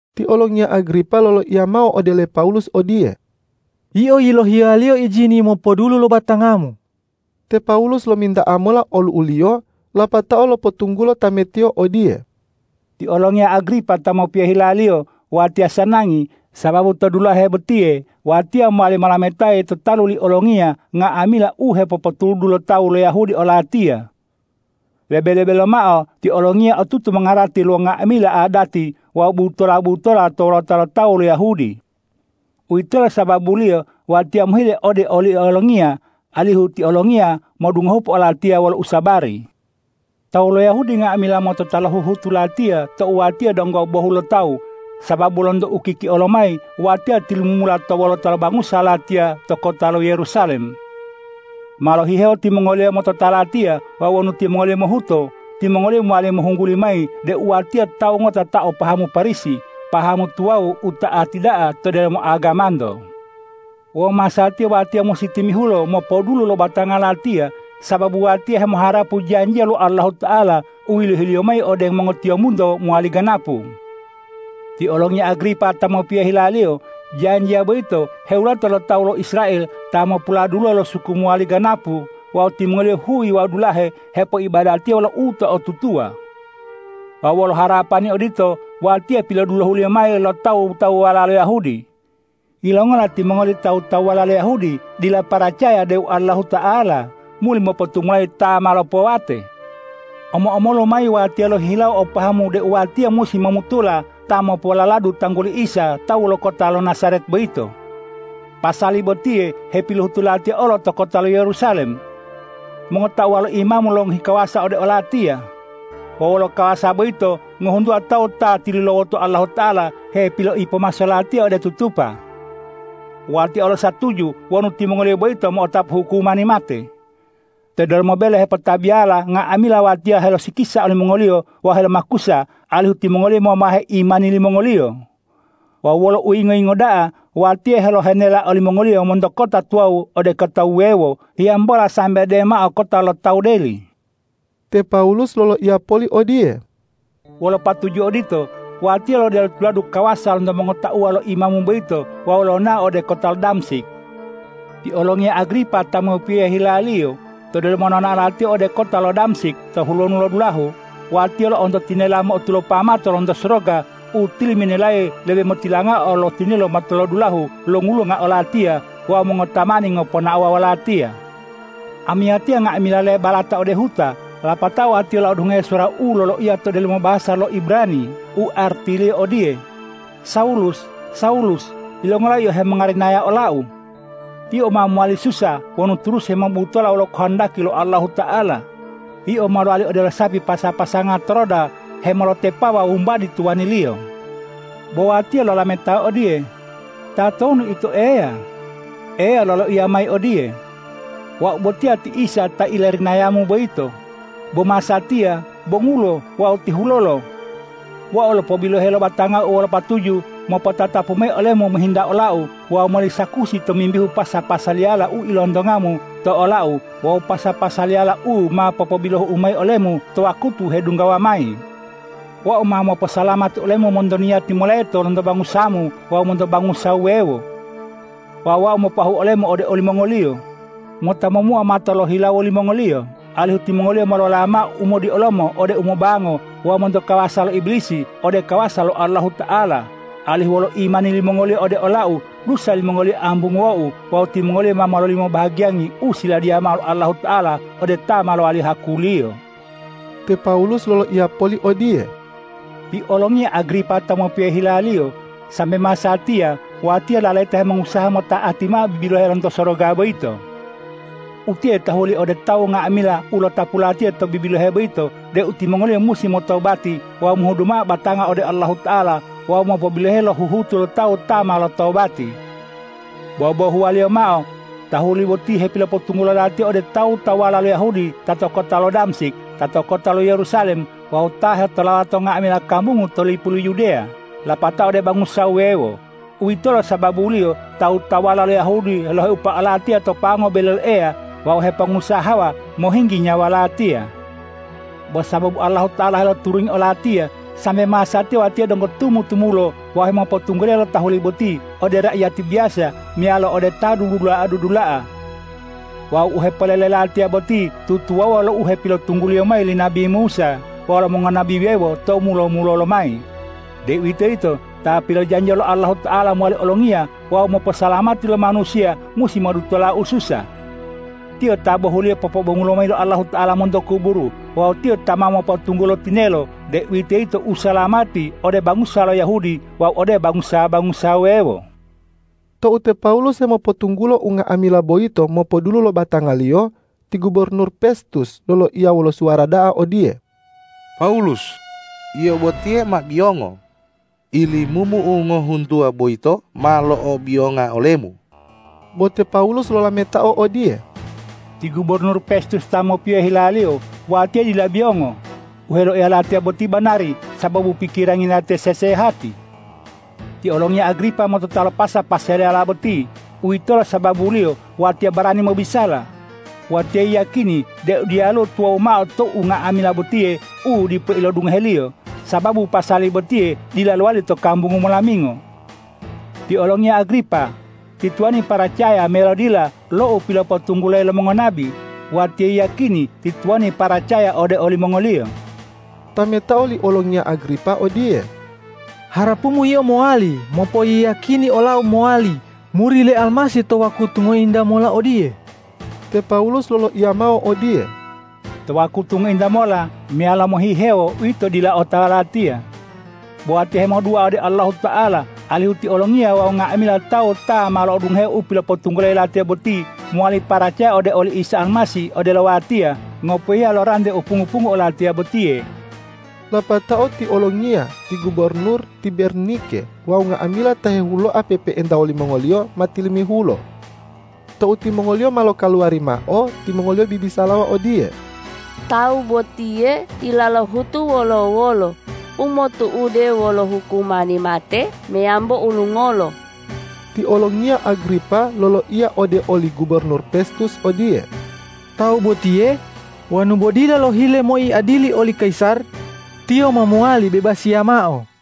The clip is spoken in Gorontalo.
Ti olongiya Agripa loloiya mao ode le Pawulus odiye,”Yio yilohiyaliyo ijini mopodulu lo batangamu.” Te Pawulus lominta'a mola olu'uliyo, lapatao lopotunggulo tametiyo odiye, ”Ti olongiya Agripa ta mopiyohe hilaliyo, watiya sanangi, sababu to dulahe botiye watiya mowali molametayi to talu li olongiya nga'amila u hepopotuludu lo tawu lo Yahudi olatiya. Lebe-lebe lomao ti olongiya otutu mongarati lo nga'amila adati wawu butola-butola to wolota lo tawu lo Yahudi. Uwitolo sababuliyo watiya mohile ode oli olongiya alihu ti olongiya modungohupo olatiya wolo usabari. Tawu lo Yahudi nga'amila motota lo huhutu latiya tou watiya donggo bohulotawu, sababu lonto ukikia lomayi watiya tilumumula to wolota lo bangusa latiya to kota lo Yerusalem. Ma lohihewo timongoliyo motota latiya wawu wonu timongoliyo mohuto, timongoliyo mowali mohungguli mayi deu watiya tawu ngota ta o pahamu Parisi, pahamu tuwawu u ta'ati da'a to delomo agamanto. Wawu masatiya watiya musi timihulo mopodulu lo batanga latiya, sababu watiya hemoharapu janjiya lo Allahuta'ala u yilohi-Liyo mayi ode mongotiyombunto mowali ganapu. Ti olongiya Agripa ta mopiyohe hilaliyo, janjiya boyito hewulata lo tawu lo Israel ta mopuladuluwo lo suku mowali ganapu wawu timongoliyo huyi wawu dulahe hepoibadatiya wolo uto'otutuwa. Wawu wolo harapani odito, watiya pilodulohuliyo mayi lo tawu-tawuwala lo Yahudi. Yilongola timongoli tawu-tawuwala lo Yahudi dila paracaya deu Allahuta'ala muli mopotumulayi ta ma lopowate? Omo-omolu mayi watiya lohihilawo o pahamu deu watiya musi momutola ta mopololadu tangguli Isa tawu lo kota lo Najaret boyito. Pasali botiye hepilohutu latiya olo to kota lo Yerusalem. Mongotauwa lo imamu longohi kawasa ode olatiya. Wawu wolo kawasa boyito ngohuntuwa tawu ta tilulawoto Allahuta'ala hepiloipomaso latiya ode tutupa. Watiya olo satuju wonu timongoliyo boyito mo'otapu hukumani mate. To delomo bele hepotabiyala nga'amila watiya helosikisa olimongoliyo wawu helomakusa, alihu timongoliyo momahe imani limongoliyo. Wawu wolo uyingo-yingo da'a, watiya helohenela olimongoliyo monto kota tuwawu ode kota wuwewo, hiyambola sambe demao kota lo tawu deli.” Te Pawulus loloiya poli odiye,”Wolo patuju odito, watiya lodelo tuladu kawasa lonto mongotauwa lo imamu boyito wawu lonao ode kota lo Damsik. Ti olongiya Agripa ta mopiyohe hilaliyo, to delomo nonao latiya ode kota lo Damsik to hulonu lo dulahu, watiya lo'onto tinela mo'otulopa mato lonto soroga u tiliminelayi lebe motilangao lo tinelo matolodulahu longulunga olatiya wawu mongotamani ngoponaowa wolatiya. Amiyatiya nga'amila lebalata ode huta, lapatao watiya lo'odungohe suwara u loloiya to delomo bahasa lo Ibrani u artiliyo odiye, ’Sawulus, Sawulus! Yilongola yio hemongarinaya ola-U? Yio ma mowali susa wonu turusi hemobutola wolo kohondaki lo Allahuta'ala. Yio ma mowali odelo sapi pasa-pasanga to roda hemolotepawa wumbadi tuwaniliyo.’ Bo watiya lolametao odiye, ’Tatonu Ito, Eya?’ Eya loloiya mayi odiye, ’Wau botiya ti Isa ta ilarinayamu boyito. Bo masatiya bongulo wawu tihulolo. Wau lopobiloheyi lo batanga-U wolo patuju mopotatapu mayi olemu mohinta ola-U wawu mowali sakusi tomimbihu pasa-pasaliyala u ilontongamu to ola-U wawu pasa-pasaliyala u ma popobilohu-U mayi olemu to wakutu hedunggawa mayi. Wau ma moposalamati olemu monto niyati moleto lonto bangusamu wawu monto bangusa wuwewo. Wawu Wau mopoahu olemu ode olimongoliyo mota momuo mato lo hilawo limongoliyo, alihu timongoliyo molola mao umodiolomo ode umobango wawu monto kawasa lo Ibilisi ode kawasa lo Allahuta'ala, alihu wolo imani limongoliyo ode ola-U dusa limongoliyo ambunguwo-U wawu timongoliyo ma mololimo bahagiyangi u siladiya mao lo Allahuta'ala ode ta ma lowali haku-Liyo.’” Te Pawulus loloiya poli odiye,”Ti olongiya Agripa ta mopiyohe hilaliyo, sambe masatiya watiya lalayita hemongusaha mota'ati mao bibilohe lonto soroga boyito. Utiye tahuli ode tawu nga'amila u lotapu latiya to bibilohe boyito deu timongoliyo musi motobati wawu mohudu mao batanga ode Allahuta'ala wawu mopobiloheyi lo huhutu lo tawu ta ma lotobati. Bobohuwaliyo mao tahuli boti hepilopotunggulo latiya ode tawu-tawuwala lo Yahudi ta to kota lo Damsik, ta to kota lo Yerusalem wawu ta hetolawa to nga'amila kambungu to lipu lo Yudeya, lapatao ode bangusa wuwewo. Uwitolo sababuliyo tawu-tawuwala lo Yahudi loheupa olatiya to pango bele lo Eya wawu hepongusahawa mohinggi nyawa latiya. Bo sababu Allahuta'ala heloturungi olatiya, sambe masatiya watiya donggo tumu-tumulo wawu hemopotunggulayi lo tahuli boti ode raiyati biyasa meyalo ode ta dudula'a-dudula'a. Wawu u hepolele mayi latiya boti tutuwawuwa lo u hepilopotungguliyo mayi li nabi Musa wawu lo mongonabi wuwewo tou mulo-mulolo mayi, deuwitoyito Ta pilojanjiya lo Allahuta'ala mowali Olongiya wawu moposalamati lo manusiya musi modutola ususa. Tiyo ta bohuliyo popobongulo mayi lo Allahuta'ala monto kuburu wawu Tiyo ta ma mopotunggulo tinelo, deuwitoyito usalamati ode bangusa lo Yahudi wawu ode bangusa-bangusa wuwewo.” Tou te Pawulus hemopotunggulo unga'amila boyito mopodulu lo batangaliyo, ti gubornur Pestus loloiya wolo suwara da'a odiye,”Pawulus, yio botiye ma biyongo! Ilimumu u ngohuntuwa boyito ma lo'obiyonga olemu.” Bo te Pawulus lolametao odiye,”Ti gubornur Pestus ta mopiyohe hilaliyo, watiya dila biyongo! U heloiya latiya boti banari sababu pikirangi latiya sesehati! Ti olongiya Agripa motota lo pasa-pasaliyala boti. Uwitolo sababuliyo watiya barani mobisala. Watiya yiyakini deu diyaluwo tuwawu mao to unga'amila botiye u dipo ilodungoheliyo, sababu pasali botiye dila lowali to kambungu molamingo. Ti olongiya Agripa, ti tuwani paracaya meyalo dila lo u pilopotunggulayi lo mongonabi? Watiya yiyakini ti tuwani paracaya ode olimongoliyo.” Tametao li olongiya Agripa odiye,”Harapumu yio mowali mopoyiyakini olau mowali muri le Almasih to wakutu ngointa mola odiye!” Te Pawulus loloiya mao odiye,”To wakutu ngointa mola meyalo mohihewo uwito dila otawa latiya. Bo watiya hemodua ode Allahuta'ala alihu ti olongiya wawu nga'amila tawu ta ma lo'odungohe u pilopotunggulayi latiya boti, mowali paracaya ode oli Isa Almasih odelo watiya, ngopohiya lo rante u pungu-pungu olatiya botiye.” Lapatao ti olongiya, ti gubornur, ti Bernike wawu nga'amila ta hehuloa pe'epe'enta wolimongoliyo ma tilimihulo. Tou timongoliyo ma lokaluwari mao, timongoliyo bibisalawa odiye,”Tawu botiye dila lohutu wolo-wolo umotu'ude wolo hukumani mate meyambo ulungolo.” Ti olongiya Agripa loloiya ode oli gubornur Pestus odiye,”Tawu botiye wonu bo dila lohile moiadili oli kayisar, tiyo ma mowali bebasiya mao.”